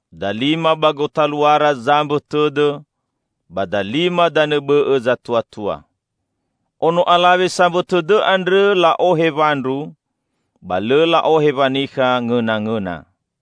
Dalima ba gotaluara zambõ tõdõ ba dalima danõ bõ'õ zatuatua. Ono alawe sambõ tõdõ andrõ la'ohe wandru, ba lõ la'ohe wanikha ngõnangõna.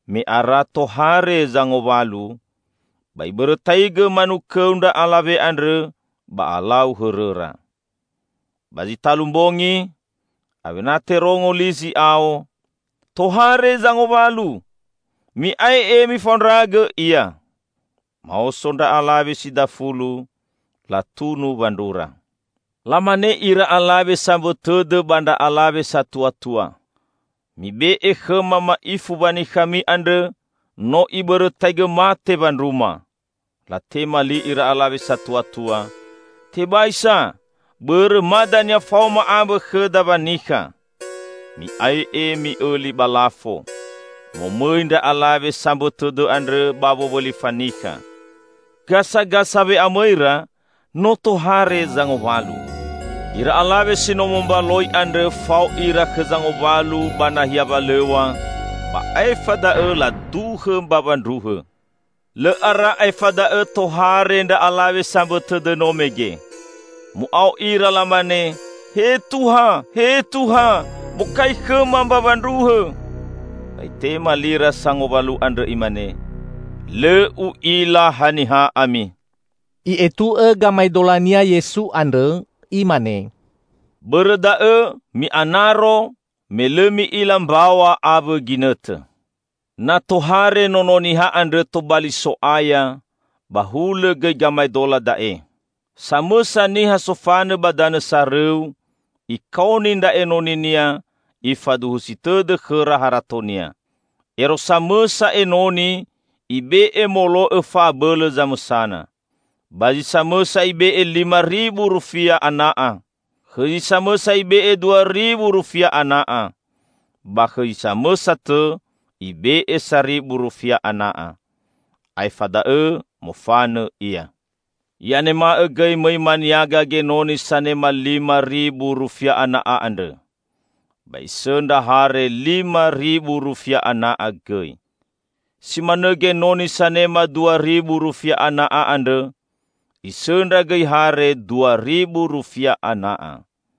Me ara tohare zangowalu ba ibõrõtaigõ manukõu ndra alawe andrõ ba alau hõrõra. Ba zi talu mbongi, awena terongo li zi'ao, 'Tohare zangowalu! Mi'ae'e mifaondragõ ia!' Maoso ndra alawe si dafulu, latunu wandrura. Lamane ira alawe sambõ tõdõ ba ndra alawe satuatua, 'Mibe'e khõma ma'ifu wanikhami andrõ, no ibõrõtaigõ mate wandruma.' Latema li ira alawe satuatua, 'Tebai sa! Bõrõ ma dania faoma ambõ khõda wanikha. Mi'ae'e mi'õli ba lafo!' Mo mõi ndra alawe sambõ tõdõ andrõ ba wowõli fanikha. Gasagasa we'amõira, no tohare zangowalu. Ira alawe si no mombaloi andrõ fao ira khõ zangowalu ba nahia walõw̃a, ba aefa da'õ laduhõ mbawa ndruhõ! Lõ ara aefa da'õ tohare ndra alawe sambõ tõdõ no mege. Mu'ao ira lamane, 'He Tuha, he Tuha, bokai khõma mbawa ndruhõ!' Ba itema lira sangowalu andrõ imane, 'Lõ u'ila haniha ami!'" I'etu'õ gamaedolania Yesu andrõ Imane, "Bõrõ da'õ, mi'anaro, me lõ mi'ila mbaw̃a awõ ginõtõ." "Na tohare Nono Niha andrõ tobali So'aya, ba hulõ gõi gamaedola da'e. Samõsa niha sofanõ ba danõ sarõu, ikaoni ndra enoninia, ifaduhusi tõdõ khõra haratonia. Ero samõsa enoni ibe'e molo'õ fa'abõlõ zamõsana. Ba zi samõsa ibe'e lima ribu rufia ana'a. Khõ zi samõsa ibe'e dua ribu rufia ana'a, ba khõ zi samõsa tõ ibe'e saribu rufia ana'a. Aefa da'õ mofanõ ia. I'anema'õ gõi mõi maniaga genoni sanema lima ribu rufia ana'a andrõ. Ba isõndra hare lima ribu rufia ana'a gõi. Si manõ genoni sanema dua ribu rufia ana'a andrõ, isõndra gõi hare dua ribu rufia ana'a.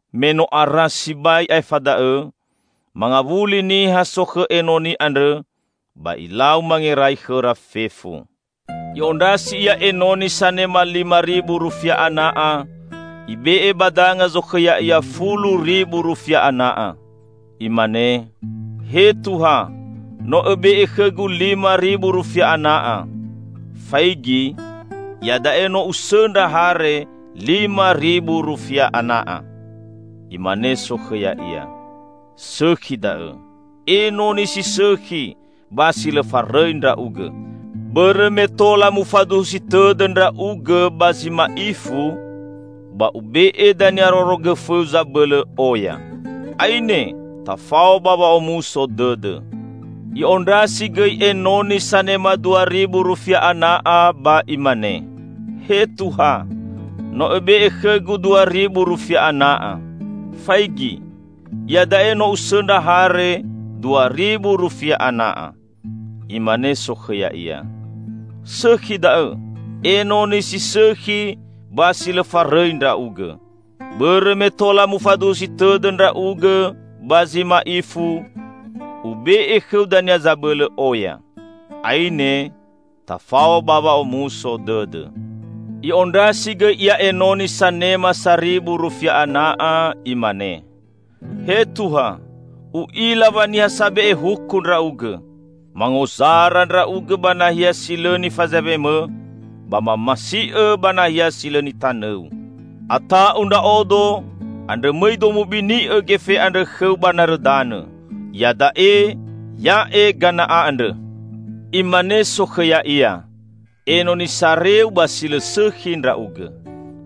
Me no ara sibai aefa da'õ, mangawuli niha sokhõ enoni andrõ, ba ilau mangerai khõra fefu. I'ondrasi ia enoni sanema lima ribu rufia ana'a, ibe'e ba danga zokhõ ya'ia fulu ribu rufia ana'a. Imane, 'He Tuha, no õbe'e khõgu lima ribu rufia ana'a. Faigi, ia da'e no usõndra hare lima ribu rufia ana'a.' Imane sokhõ ya'ia, 'Sõkhi da'õ, enoni si sõkhi ba si lõ farõi ndra'ugõ. Bõrõ me tola mufaduhusi tõdõ ndra'ugõ ba zi ma'ifu, ba ube'e dania rorogõfõu zabõlõ oya. Aine! Tafao ba wa'omuso dõdõ!' I'ondrasi gõi enoni sanema dua ribu rufia ana'a ba imane, 'He Tuha, no õbe'e khõgu dua ribu rufia ana'a. Faigi! Iada'e no usõndra hare dua ribu rufia ana'a.' Imane sokhõ ya'ia, 'Sõkhi da'õ! Enoni si sõkhi ba si lõ farõi ndra'ugõ. Bõrõ me tola mufaduhusi tõdõ ndra'ugõ ba zi ma'ifu, ube'e khõu dania zabõlõ oya. Aine, tafao ba wa'omuso dõdõ!' I'ondrasi gõi ia enoni sanema saribu rufia ana'a, imane, 'He Tuha, u'ila wa niha sabe'e huku ndra'ugõ. Mangozara ndra'ugõ ba nahia si lõ nifazaewemõ ba mamasi'õ ba nahia si lõ nitanõu. Ata'u ndra'odo, andrõ mõido mubini'õ gefe andrõ khõu ba narõ danõ. Iada'e, ya'e gana'a andrõ!' Imane sokhõ ya'ia, 'Enoni sareu ba si lõ sõkhi ndra'ugõ.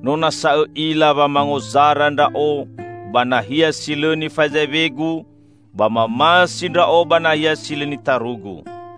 No nasa õ'ila wa mangozara ndra'o ba nahia si lõ nifazaewegu ba mamasi ndra'o ba nahia si lõ nitarugu.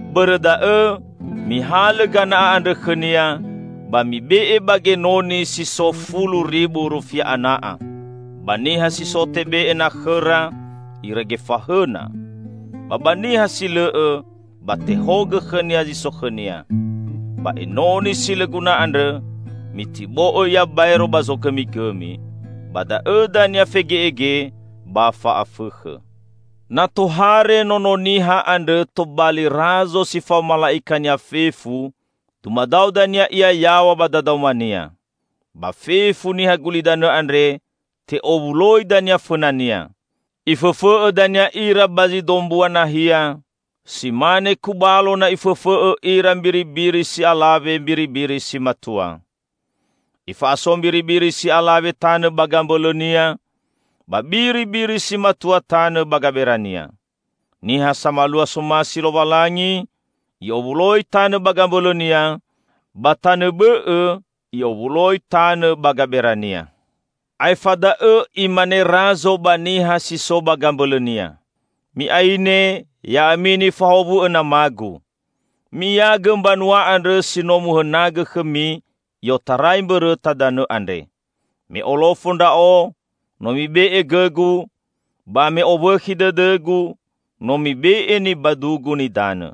Bõrõ da'õ, mihalõ gana'a andrõ khõnia, ba mibe'e ba genoni si so fulu ribu rufia ana'a. Ba niha si so tebe'e na khõra, irege fahõna. Ba ba niha si lõ'õ, ba tehogõ khõnia zi so khõnia. Ba enoni si lõ guna andrõ, mitibo'õ ia baero ba zogõmigõmi. Ba da'õ dania fege'ege ba fa'afõkhõ!'" "Na tohare Nono Niha andrõ tobali Razo si fao mala'ika-Nia fefu, dumadao dania Ia yaw̃a ba dadaoma-Nia. Ba fefu niha gulidanõ andre te'owuloi dania fõna-Nia. Ifõfõ'õ dania ira ba zi dombua nahia, si mane kubalo na ifõfõ'õ ira mbiribiri si alawe mbiribiri si matua. Ifa'aso mbiribiri si alawe tanõ ba gambõlõnia ba biribiri si matua tanõ ba gabera-Nia. (Niha samalua somasi Lowalangi i'owuloi tanõ ba gambõlõ-Nia, ba tanõ bõ'õ i'owuloi tanõ ba gabera-Nia.) Aefa da'õ imane Razo ba niha si so ba gambõlõ-Nia, 'Mi'aine, ya'ami nifahowu'õ nama-Gu. Mi'iaigõ mbanua andrõ si no muhõnagõ khõmi i'otarai mbõrõta danõ andre. Me olofo Ndra'o, no mibe'e gõ-Gu, ba me owõkhi dõdõ-Gu, no mibe'e nibadu-Gu nidanõ.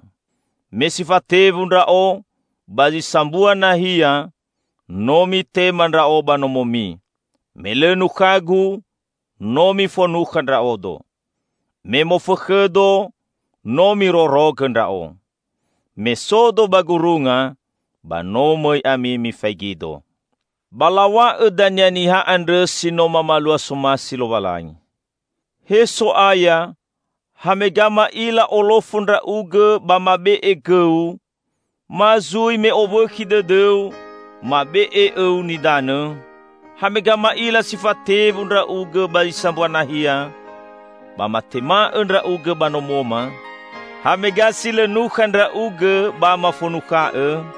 Me si fatewu Ndra'o ba zi sambua nahia, no mitema Ndra'o ba nomomi. Me lõ nukha-Gu no mifonukha Ndra'odo. Me mofõkhõ-Do no mirorogõ Ndra'o. Me so-Do ba gurunga, ba no mõi ami mifaigi-Do.' Ba law̃a'õ dania niha andrõ si no mamalua somasi Lowalangi, 'He So'aya, hamega ma'ila olofo Ndra'ugõ ba mabe'e gõ-U, ma zui me owõkhi dõdõ-U, mabe'e õ-U nidanõ? Hamega ma'ila si fatewu Ndra'ugõ ba zi sambua nahia, ba matema'-Õ Ndra'ugõ ba nomoma? Hamega si lõ nukha Ndra'ugõ ba mafonukha'-Õ?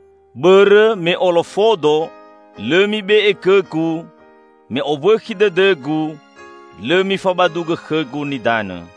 Bõrõ me olofo-Do, lõ mibe'e gõ-Gu; me owõkhi dõdõ-Gu, lõ mifabadugõ khõ-Gu nidanõ.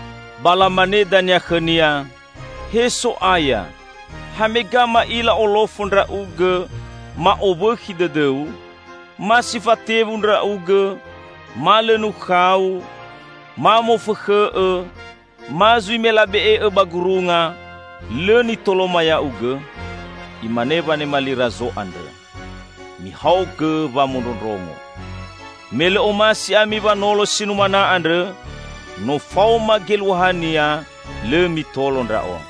Ba lamane dania khõ-Nia, 'He So'aya, hamega ma'ila olofo Ndra'ugõ, ma owõkhi dõdõ-U, ma si fatewu Ndra'ugõ, ma lõ nukha-U, ma mofõkhõ'-Õ, ma zui me labe'e'-Õ ba gurunga, lõ nitoloma Ya'ugõ?' Imane wanema li Razo andrõ, 'Mihaogõ wamondrongo: me lõ omasi ami wanolo si numana andrõ, no faoma geluahania lõ mitolo Ndra'o.'